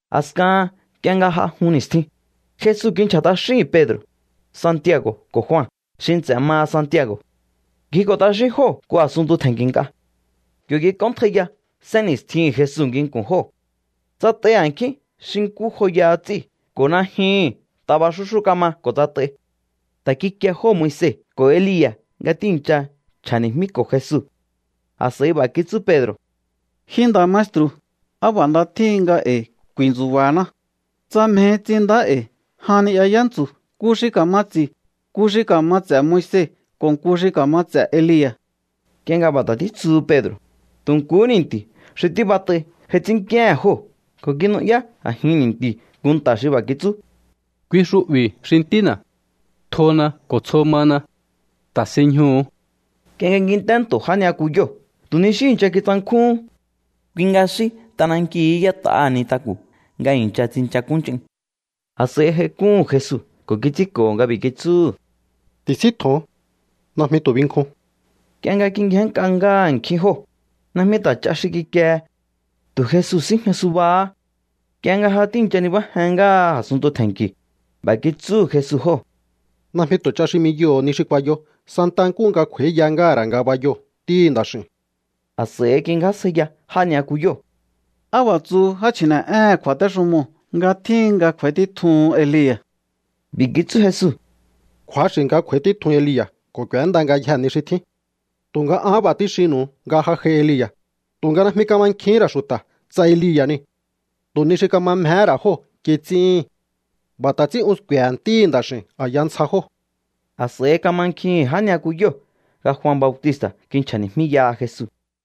A̱skahan nk'ie nga j'a jun ni̱stjin, Jesu kinchja̱ t'axíhi̱n Pedro̱, Santiago̱ ko̱ Jua xi nts'e̱ maha Santiago̱. Ngjiko̱ t'axín jóo̱ nku a̱sunntu tje̱nki̱ nk'a. Yo̱ kik'óntjaiya sénni̱stjihi̱n Jesu nginku̱n jóo̱. Tsat'ai a̱nkjín xi nkú joyaha ts'íu̱ ko̱ najyuhu̱n taba xúxú kama ko̱ tsat'ai. Ta̱ kikie jóo̱ Moise ko̱ Elia̱ nga ti̱íncha nchja̱ni̱jmíko̱ Jesu. A̱s'a̱i b'a̱ kitsú Pedro̱: —Ji nda̱ maestru̱, ¡á b'a̱ nda tjíhin nga e̱i̱ ku̱i̱ntsu̱ba̱haná! Tsa mjehi, ts'inndá e̱i̱ jan ni'ya yántsu̱, nku xi ka̱ma ts'i̱, nku xi ka̱ma ts'e̱ Moise ko̱ nku xi ka̱ma ts'e̱ Elia̱. Nk'ie nga b'a̱ ta̱ títsuhu Pedro̱, tu̱ nkuhú ni̱nti̱ xi tíbat'ai j'ai ts'ínnk'íéhe̱n jóo̱ ko̱ kinu'yá a̱jin ni̱nti̱u̱ nku nta̱ xi b'a̱ kitsú: —Kui xu'bi̱ xi Ntína̱. Tjona ko̱ tsjo mana. Ta̱sinñjuhu̱u. Nk'ie nga kint'é nto̱ já ni'yakuyóo̱ tu̱ ni xí i̱ncha kitsankjúhún. Kui nga xí t'anankiu̱hú y'ét'aha nintaku̱ nga i̱ncha tsinchakúnch'in. A̱s'a̱i j'aik'úhu̱n Jesu ko̱ kits'ínko̱ho̱ nga b'i̱ kitsúhu̱: —Tisíntjo̱on. Najmi tu̱ binkjun. Nk'ie nga kingjénnk'a ngáha a̱nkjín jóo̱, najmi ta̱ ch'a xi kikiehe. Tu̱ Jesu síjña subahá. Nk'ie nga ja tíi̱ncha nibájen ngáha a̱sunntu tje̱nki̱u̱, b'a̱ kitsúhu̱ Jesu jóo̱: —Najmi tu̱ ch'a xi 'miyoho̱o ni xi kuayo santaha nkúhu nga kj'u̱a̱íya ngáha̱ ra̱ ngabayoo̱ Ntíhi̱ Nda̱x'i̱u̱n. A̱s'a̱i kingjásjaiya já ni'yakuyóo̱: —¿Á b'a̱ tsuhu já chji̱ne̱'éhe̱n kju̱a̱téxumoo̱ nga tjíhin nga kj'u̱a̱í títjuhun Elia̱? B'i̱ kitsú Jesu: —Kju̱axi̱ nga kj'u̱a̱í títjun Elia̱ ko̱ k'u̱énda ngayjee̱ ni xi tjín. Tu̱nga an b'a̱ tíxinnu̱u nga ja j'ai Elia̱, tu̱nga najmi kamankjihín ra̱ xu̱ta̱ tsa Elia̱ niu̱. Tu̱ ni xi kama mjehé ra̱ jóo̱ kits'íhi̱n. B'a̱ ta̱ ts'ín un sku̱e̱he̱ Ntíhi̱ Nda̱x'i̱u̱n a̱ya ntsja jóo̱. A̱s'a̱i kamankjihi̱n já ni'yakuyóo̱ nga Jua Bautista̱ kinchja̱ni̱jmíyaha Jesu.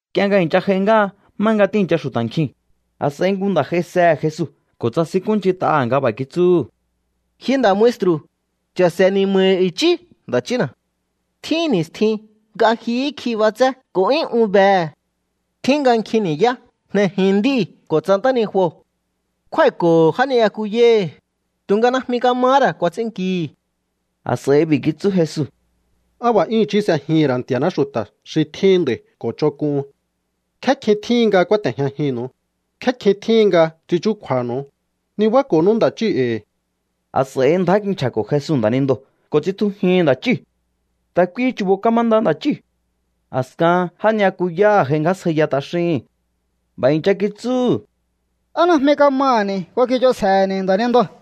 Nk'ie nga i̱ncha j'ai ngáha má nga tíi̱ncha xu̱ta̱ nkjiu̱n, a̱s'a̱i nku nda̱ j'aisehe̱ Jesu ko̱ tsasinkúnch'int'aha̱ nga b'a̱ kitsúhu̱: —Ji nda̱ maestru̱, cha̱se̱ ni̱ma̱hi̱ i̱chí nda̱ chína̱. Tjín ni̱stjin nga jyuhú kj'i b'atsé ko̱ 'yún un behe̱. Tjín nga nkjin ni̱yá jnejin nd'íu̱ ko̱ tsa ntánijuo̱. Kjúái̱ko̱ho̱ já ni'yakuyáhi̱, tu̱nga najmi kamahá ra̱ kuats'ínnkihi̱. A̱s'a̱i b'i̱ kitsú Jesu: —¡Á b'a̱ 'yún i̱chí s'ejihi̱n ra̱ Nti̱a̱ná xu̱ta̱ xi tjíhin nd'a̱i̱ ko̱ ch'onk'uhun! ¿Nkjé kjin tjíhin nga kúáte̱jñajinnu̱u? ¿Nkjé kjin tjíhin nga ts'in chúkju̱a̱nu̱u? Nibáko̱nú nda̱ chíu̱ e̱i̱. A̱s'a̱i ndjá kinchja̱ko̱ Jesu nda̱nindoo̱ ko̱ tsitjujihi̱n nda̱ chíu̱. Ta̱ kuihi chu̱bo̱ kamanda nda̱ chíu̱. A̱skahan já ni'yakuyáha̱ j'aingjásjaiya t'axíhi̱n. B'a̱ i̱ncha kitsúhu̱: —¿Á najmi kamaha̱ni̱ kuakich'onsje̱he̱ni̱ nda̱nindoo̱?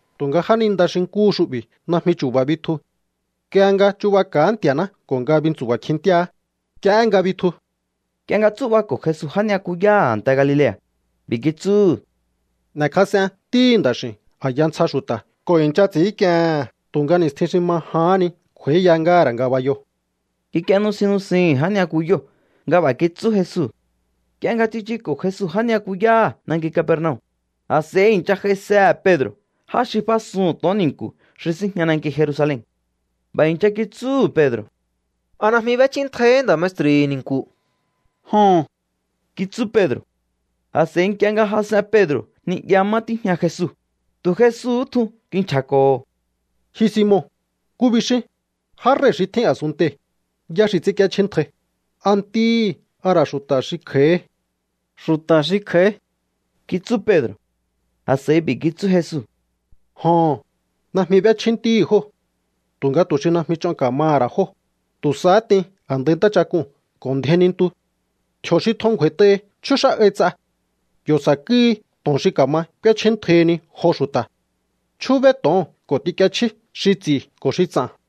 Tu̱nga jáninda xi nkúhu xu'bi̱ najmi chu̱ba̱ bitju. Nk'ie nga chu̱baka̱áhá Nti̱a̱ná ko̱ nga bintsu̱ba̱ kjintíaá, nk'iehé nga bitju. Nk'ie nga tsú'bako̱ Jesu já ni'yakuyáha̱ a̱nte Galilea̱, b'i̱ kitsúhu̱: —N'e̱kjas'en Ntíhi̱ Nda̱x'i̱u̱n a̱ya ntsja xu̱ta̱ ko̱ i̱ncha ts'i̱ínk'iehe̱n. Tu̱nga ni̱stjin xi ma jahán ni kj'u̱a̱íya ngáha̱ ra̱ ngabayoo̱. Kik'ie nusin nusihi̱n já ni'yakuyóo̱ nga b'a̱ kitsú Jesu. Nk'ie nga tsichuko̱ Jesu já ni'yakuyáha̱ nanki Capernaum, a̱s'a̱i i̱ncha j'aisehe̱ Pedro̱ já xi f'ásuhu̱n to̱on ni̱nku̱ xi síjña nanki Jerusalen. B'a̱ i̱ncha kitsúhu̱ Pedro̱: —¿A najmi b'échjíntjaihí nda̱ maestru̱hi̱ ni̱nku̱? —Joho̱n —kitsú Pedro̱. A̱s'a̱i nk'ie nga jas'en Pedro̱ ni'ya má tíjña Jesu, tu̱ Jesuhú tjun kinchja̱ko̱ho̱: —Ji Simon, ¿nkú bixín? Já rei̱ xi tjín a̱sunntei̱, ¿yá xi ts'ínk'íéchjíntjai? ¿A ntíhi̱, a ra̱ xu̱ta̱ xi kj'a̱íhí? —Xu̱ta̱ xi kj'a̱í —kitsú Pedro̱. A̱s'a̱i b'i̱ kitsú Jesu: —Joho̱n, najmi b'échjí ntíhi̱ jóo̱. Tu̱nga tu̱ xi najmi ch'on ka̱maha̱ ra̱ jóo̱, tu̱ sahá t'in a̱ndai ntáchak'uu̱n ko̱ ndjein nintu. Tji̱o̱ xi tjun ngju̱a̱i̱t'ahi chjúx'á'ai ts'a. Yo̱ sa̱kúhi to̱on xi ka̱ma k'úéchjíntjaihini jo xu̱ta̱. Chjúbéí to̱oo̱n ko̱ t'ink'iechjí xi ts'i̱ ko̱ xi ts'a̱n.